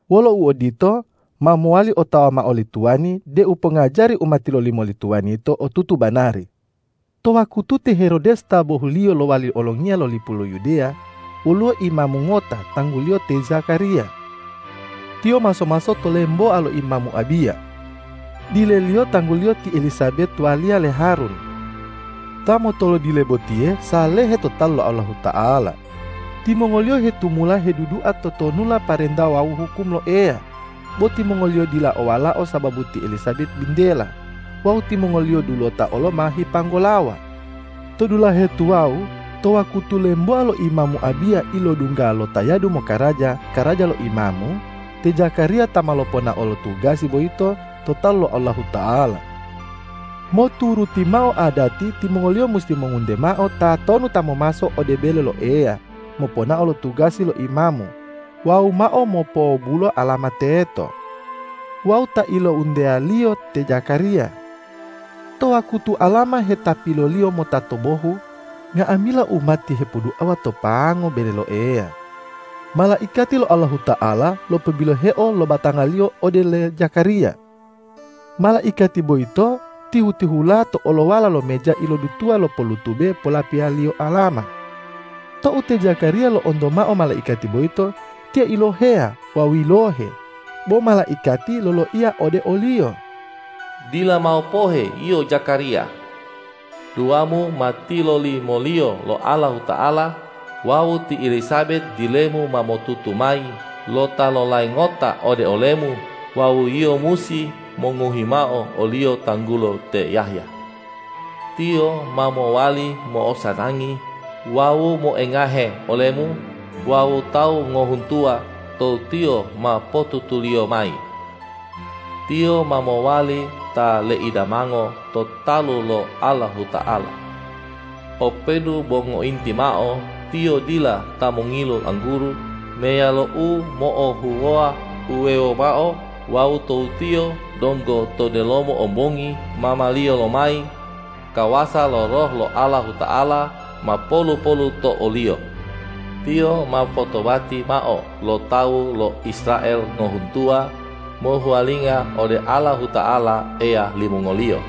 Wolo uodito, ma mowali otawa mao li tuwani deu pongajari u ma tilolimo li tuwani yito otutu banari. To wakutu te Herodes ta bohuliyo lowali olongiya lo lipu lo Yudeya, woluwo imamu ngota tangguliyo te Zakariya. Tiyo maso-maso to lemboa lo imamu Abiya. Dileliyo tangguliyo ti Elisabet waliya le Harun. Ta motolodile botiye salehe to talu lo Allahuta'ala. Timongoliyo hitumula hedudua totonulalo parenta wawu hukum lo Eya. Bo timongoliyo dila o walao sababu ti Elisabet bintela. Wawu timongoliyo dulota olo ma hipanggolawa. To dulahe tuwawu, to wakutu lemboa lo imamu Abiya ilodungga lo tayadu mokaraja karaja lo imamu, te Zakariya ta ma loponao lo tugasi boyito to talu lo Allahuta'ala. Moturuti mao adati, timongoliyo musi mongunte mao tatonu ta momaso ode bele lo Eya moponao lo tugasi lo imamu wawu mao mopowobulo alama teto. Wawu ta ilounteyaliyo te Zakariya. To wakutu alama hetapiloliyo mota to bohu, nga'amila umati hipoduawa to pango bele lo Eya. Malaikati lo Allahuta'ala lopobiloheo lo batangaliyo ode le Zakariya. Malaikati boyito tihu-tihula to'olowala lo meja ilodutuwa lo pollutube polapilaliyo alama. Tou te Zakariya lo'onto mao malaikati boyito, tiyo iloheya wawu yilohe. Bo malaikati loloiya ode oliyo,”Dila mao pohe yio Zakariya. Duamu ma tilolimoliyo lo Allahuta'ala wawu ti Elisabet dilemu ma motutu mayi lo ta lolai ngota ode olemu wawu yio musi mongohi mao oliyo tanggulo te Yahya. Tiyo ma mowali mo'osanangi wawu moengahe olemu wawu tawu ngohuntuwa tou tiyo ma potutuliyo mayi. Tiyo ma mowali ta leidamango to talu lo Allahuta'ala. Openu bo ngointi mao tiyo dila ta mongilu angguru meyalo u mo'ohuwoa uwewo mao wawu tou tiyo donggo to delomo ombongi mamaliyo lomayi, kawasa lo Roh lo Allahuta'ala ma polu-polu to oliyo. Tiyo ma mopotobati mao lo tawu lo Israel ngohuntuwa mohuwalinga ode Allahuta'ala Eya limongoliyo.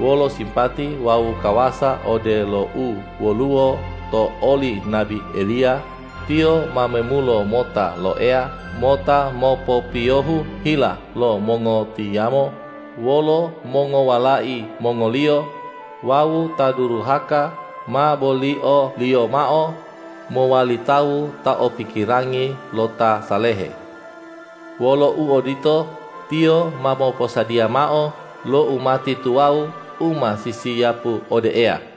Wolo sipati wawu kawasa odelo u woluwo to oli nabi Eliya, tiyo ma memulo mota lo Eya mota mopopiyohu hila lo mongotiyamo wolo mongowalai mongoliyo wawu ta duruhaka ma bolioliyo mao mowali tawu ta o pikirangi lo ta salehe. Wolo uodito, tiyo ma moposadiya mao lo umati tuwawu u ma sisiyapu ode Eya.”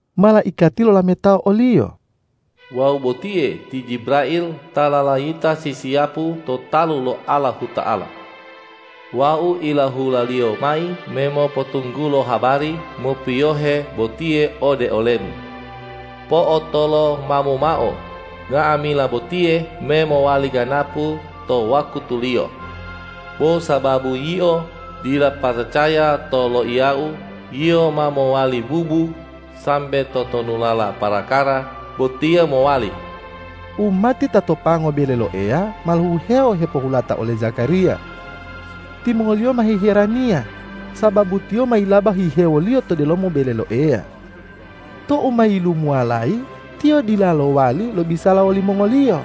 Malaikati lolametao oliyo,”Wau botiye ti Jibrail ta lalayita sisiyapu to talu lo Allahuta'ala. Wau ilahulaliyo mayi me mopotunggulo habari mopiyohe botiye ode olemu. Po'otolomamu mao, nga'amila botiye me mowali ganapu to wakutuliyo. Bo sababu yio dila paracaya to loiyau, yio ma mowali bubu, sambe totonulala parakara botiye mowali.” Umati ta to pango bele lo Eya ma lohihewo hepohulata ole Zakariya. Timongoliyo ma hiheraniya, sababu tiyo mayilaba hihewoliyo to delomo bele lo Eya. Tou ma yilumuwalayi, tiyo dila lo'owali lobisala wolimongoliyo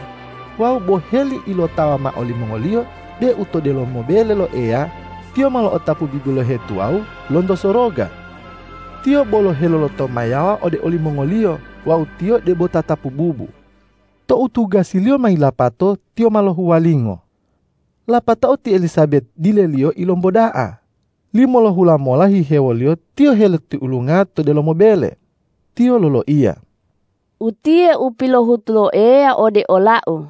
wawu boheli ilotawa mao limongoliyo deu to delomo bele lo Eya tiyo ma lo'otapu bibilohe tuwawu lonto soroga. Tiyo bolo helolotomayawa ode olimongoliyo wawu tiyo debo tatapu bubu. Tou tugasiliyo ma yilapato, tiyo ma lohuwalingo. Lapatao ti Elisabet dileliyo ilomboda'a. Limolohula mola hihewoliyo tiyo helotiulunga to delomo bele. Tiyo loloiya, ”Utiye u pilohutu lo Eya ode olau.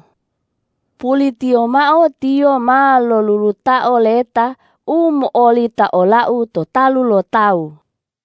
Pulitiyo mao Tiyo ma lolulutao leta u mo'olita olau to talu lo tawu.”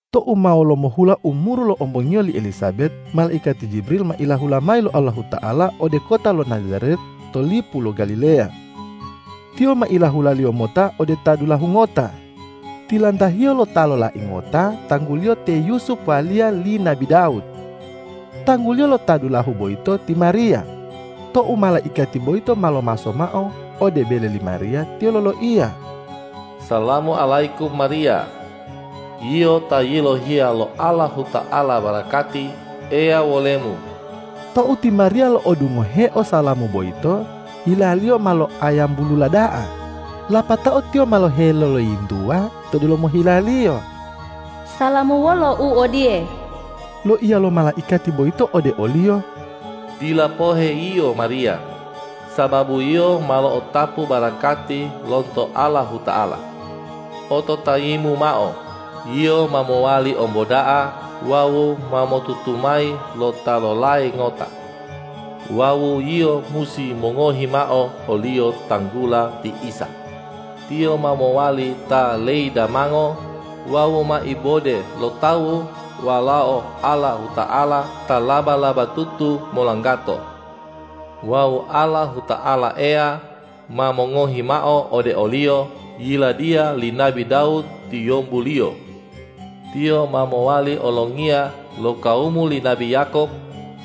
Tou ma wolomohula umuru lo ombongiyo li Elisabet, malaikati Jibrail ma ilahula mayi lo Allahuta'ala ode kota lo Najaret to lipu lo Galileya. Tiyo ma ilahula-Liyo mota ode ta dulahu ngota, tilantahiyo lo ta lolai ngota tangguliyo te Yusup waliya li nabi Dawud. Tangguliyo lo ta dulahu boyito ti Mariya. Tou malaikati boyito ma lomaso mao ode bele li Mariya, tiyo loloiya,”Salamu alayikum Mariya. Yio ta yilohiya lo Allahuta'ala barakati, Eya wolemu!” Tou ti Mariya lo'odungoheo salamu boyito, hilaliyo ma loa'ayambulula da'a, lapatao tiyo ma heloloyintuwa to delomo hilaliyo,”Salamu wolo u odiye.” Loiya lo malaikati boyito ode oliyo,”Dila pohe yio Mariya, sababu yio malo'otapu barakati lonto Allahuta'ala. Ototayimu mao, yio ma mowali omboda'a wawu ma motutumayi lo ta lolai ngota. Wawu yio musi mongohi mao oliyo tanggula ti Isa. Tiyo ma mowali ta leidamango wawu ma ibode lo tawu Walao Allahuta'ala ta laba-labatutu molanggato. Wawu Allahuta'ala Eya ma mongohi mao ode o-Liyo yiladiya li nabi Dawud tiyombu-Liyo. Tiyo ma mowali olongiya lo kawumu li nabi Yakob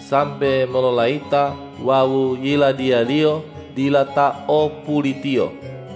sambe mololayita wawu Yiladiya-Liyo dila ta o pulitiyo.”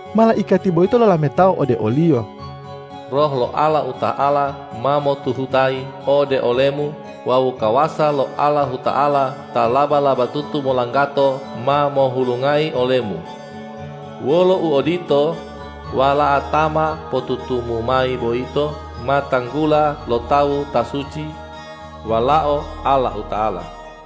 Malaikati boyito lolametao ode oliyo,”Roh lo Allahuta'ala ma motuhutayi ode olemu wawu kawasa lo Allahuta'ala ta laba-labatutu molanggato ma mohulungayi olemu. Wolo uodito, Wala'a ta ma potutumu mayi boyito ma tanggula lo tawu Ta suci, Walao Allahuta'ala.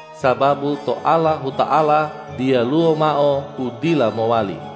Sababu to Allahuta'ala diyalu mao u dila mowali.”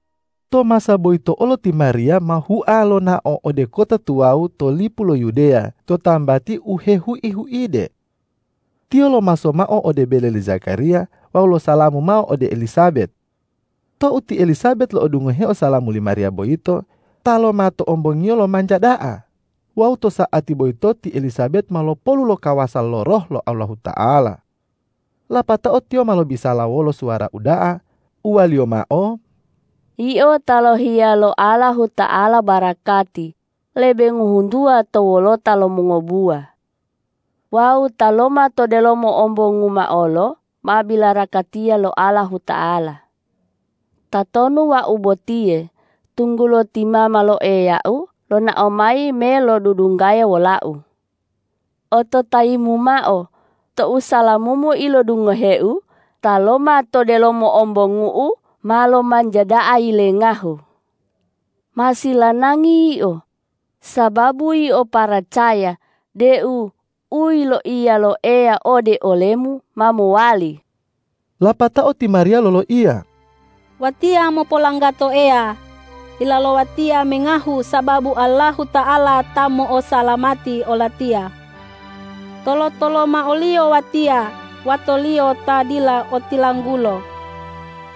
To masa boyito olo ti Mariya ma hua lonao ode kota tuwawu to lipu lo Yudeya to tambati u hehui-huide. Tiyo lomaso mao ode bele le Zakariya wawu losalamu mao ode li Elisabet. Tou ti Elisabet lo'odungohe salamu li Mariya boyito, taloma to ombongiyo lomanja da'a wawu to sa'ati boyito ti Elisabet ma lopolu lo kawasa lo Roh lo Allahuta'ala. Lapatao tiyo ma lobisala wolo suwara uda'a, uwaliyo mao,”Yio ta yilohiya lo Allahuta'ala barakati lebe ngohuntuwa to wolota lo mongobuwa! Wawu Taloma to delomo ombonguma olo ma bilarakatiya lo Allahuta'ala! Tatonu wau botiye, tunggulo ti mama lo Eyau lonao mayi me lodudunggaya wolau? Ototayimu mao, tou salamumu ilodungoheu, taloma to delomo ombongu'u ma lomanja da'a yilengahu. Ma silanagi yio, sababu yio paracaya deu u yiloiya lo Eya ode olemu ma mowali!” Lapatao ti Mariya loloiya,”Watiya mopolanggato Eya; hila lowatiya mengahu sababu Allahuta'ala ta mo'osalamati olatiya. Tolo-toloma o-Liyo watiya, wato-Liyo ta dila otilanggulo.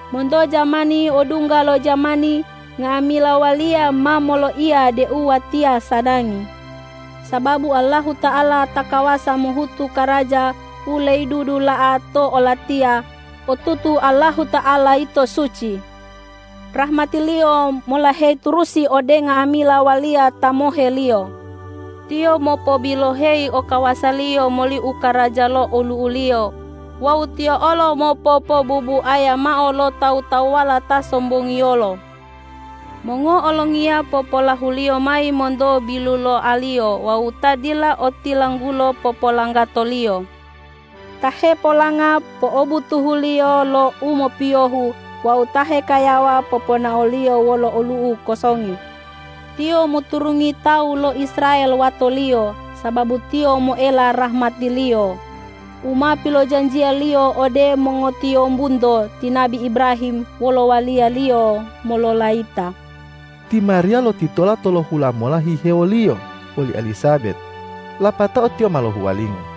Monto jamani odungga lo jamani nga'amila waliya ma moloiya deu watiya sanangi, sababu Allahuta'ala ta kawasa mohutu karaja u leidudula'a to olatiya; otutu Allahuta'ala yito suci. Rahmati-Liyo molaheyi turusi ode nga'amila waliya ta mohe-Liyo. Tiyo mopobiloheyi okawasa-Liyo moli u karaja lo olu'u-Liyo wawu Tiyo olo mopopobubuaya mao lo tawu-tawuwala ta sombongiyolo. Mongo'olongiya popolahu-Liyo mayi monto biluloaliyo wawu ta dila otilanggulo popolanggato-Liyo. Ta hepolanga po'obutuhu-Liyo lo u mopiyohu wawu ta hekayawa poponao-Liyo wolo olu'u kosongi. Tiyo moturungi tawu lo Israel wato-Liyo, sababu Tiyo moela rahmati-Liyo u ma pilojanjiya-Liyo ode mongotiyombunto ti nabi Ibrahim wolo waliya-Liyo mololayita.” Ti Mariya lotitola tolohula mola hihewoliyo woli Elisabet, lapatao tiyo ma lohuwalingo.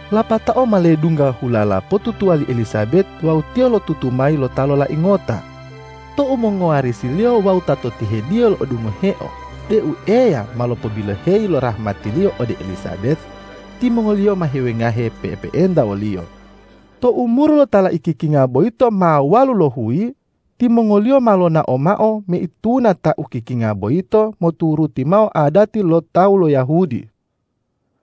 Lapatao ma ledungga hulala potutuwa li Elisabet wawu tiyo lotutu mayi lo ta lolai ngota. Tou mongowarisiliyo wawu ta to tihediyo lo'odungoheo deu Eya ma lopobiloheyi lo rahmati-Liyo ode oli Elisabet, timongoliyo ma hiwengahe pe'epe'enta woliyo. Tou umuru lo ta laikikinga boyito ma walulohuyi, timongoliyo ma lonao mao meituna ta ukikinga boyito moturuti mao adati lo tawu lo Yahudi.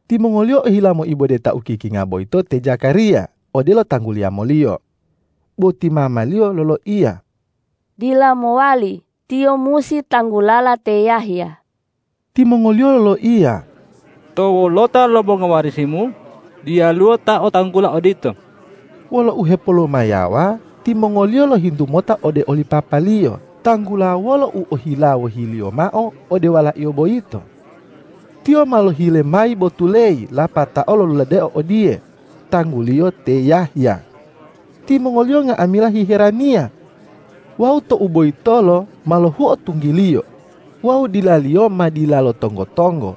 Timongoliyo ohila moibode ta ukikinga boyito te Zakariya odelo tangguli yamoliyo. Bo ti mamaliyo loloiya,”Dila mowali, tiyo musi tanggulala te Yahya.” Timongoliyo loloiya,”To wolota lo mongowarisimu, diyaluwo ta o tanggula odito.” Wolo uhepolomayawa timongoliyo lohintu mota ode li papaliyo tanggula wolo u ohila wohiliyo mao ode walaiyo boyito. Tiyo ma lohile mayi botuleyi lapatao loluladeo odiye,”Tangguliyo te Yahya.” Timongoliyo nga'amila hiheraniya. Wawu tou boyitolo ma lohuo tunggiliyo wawu dilaliyo ma dilalo tonggo-tonggo.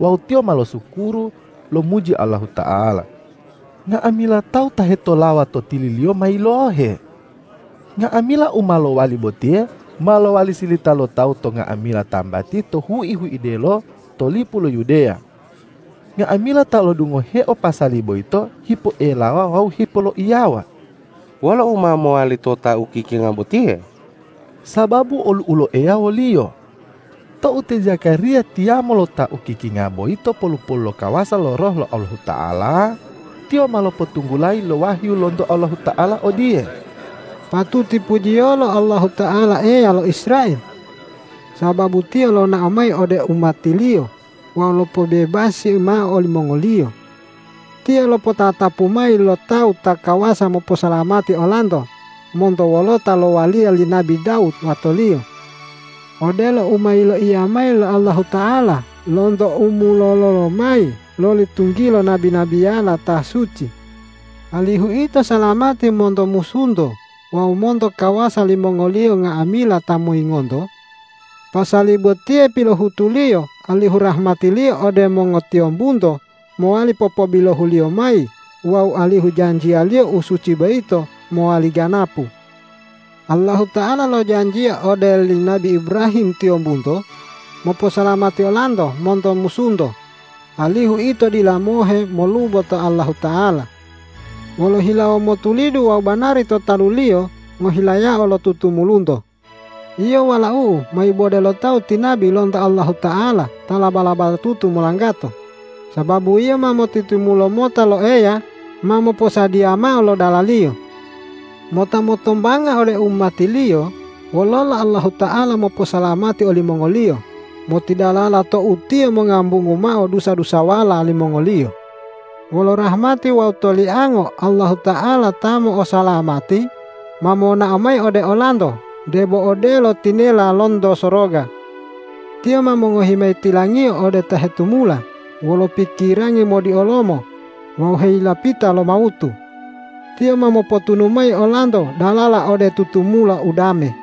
Wawu tiyo ma losukuru lomuji Allahuta'ala. Nga'amila tawu ta hetolawa to tililiyo ma yilohe. Nga'amila u ma lowali botiye ma lowali silita lo tawu to nga'amila tambati to hui-huidelo to lipu lo Yudeya. Nga'amila ta lo'odungoheo pasali boyito hipoelawa wawu hepoloiyawa,”Wolo u ma mowali to ta ukikinga botiye?” Sababu olu'u lo Eya woliyo. Tou te Zakariya tiyamo lo ta ukikinga boyito polu-polu lo kawasa lo Roh lo Allahuta'ala, tiyo ma lopotunggulayi lo wahyu lonto Allahuta'ala odiye, ”Patuti pujiyolo Allahuta'ala Eya lo Israel! Sababu Tiyo ta lonao mayi ode umati-Liyo wawu lopobebasi mao olimongoliyo. Tiyo ta lopotatapu mayi lo Tawu ta kawasa moposalamati olanto monto wolota lo waliya li nabi Dawud wato-Liyo. Odelo u ma yiloiya mayi lo Allahuta'ala lonto umololo lomayi loli tunggilo nabi-nabiyala ta suci, alihu ito salamati monto musunto wawu monto kawasa limongoliyo nga'amila ta moyingonto. Pasali botiye pilohutu-Liyo alihu rahmati-Liyo ode mongotiyombunto mowali popobilohu-Liyo mayi wawu alihu janjiya-Liyo u suci boyito mowali ganapu. Allahuta'ala lojanjiya ode li nabi Ibrahim tiyombunto moposalamati olanto monto musunto, alihu ito dila mohe molubo to Allahuta'ala wolo hilawo motulidu wawu banari to talu-Liyo ngohilayao lo tutumulunto. Yio walau'u ma ibode lo tawu ti nabi lonto Allahuta'ala ta laba-labatutu molanggato, sababu yio ma motitimulo mota lo Eya ma moposadiya mao lo dala-Liyo, mota motombanga ode umati-Liyo wololo Allahuta'ala moposalamati olimongoliyo motidalala tou Tiyo mongambungu mao dusa-dusawala limongoliyo. Wolo rahmati wawu toliango Allahuta'ala ta mo'osalamati ma monao mayi ode olanto debo odelo tinela lonto soroga. Tiyo ma mongohi mayi tilang-Iyo ode ta hetumula wolo pikirangi modiolomo wawu heyilapita lo mawutu. Tiyo ma mopotunu mayi olanto dalala ode tutumula udame.”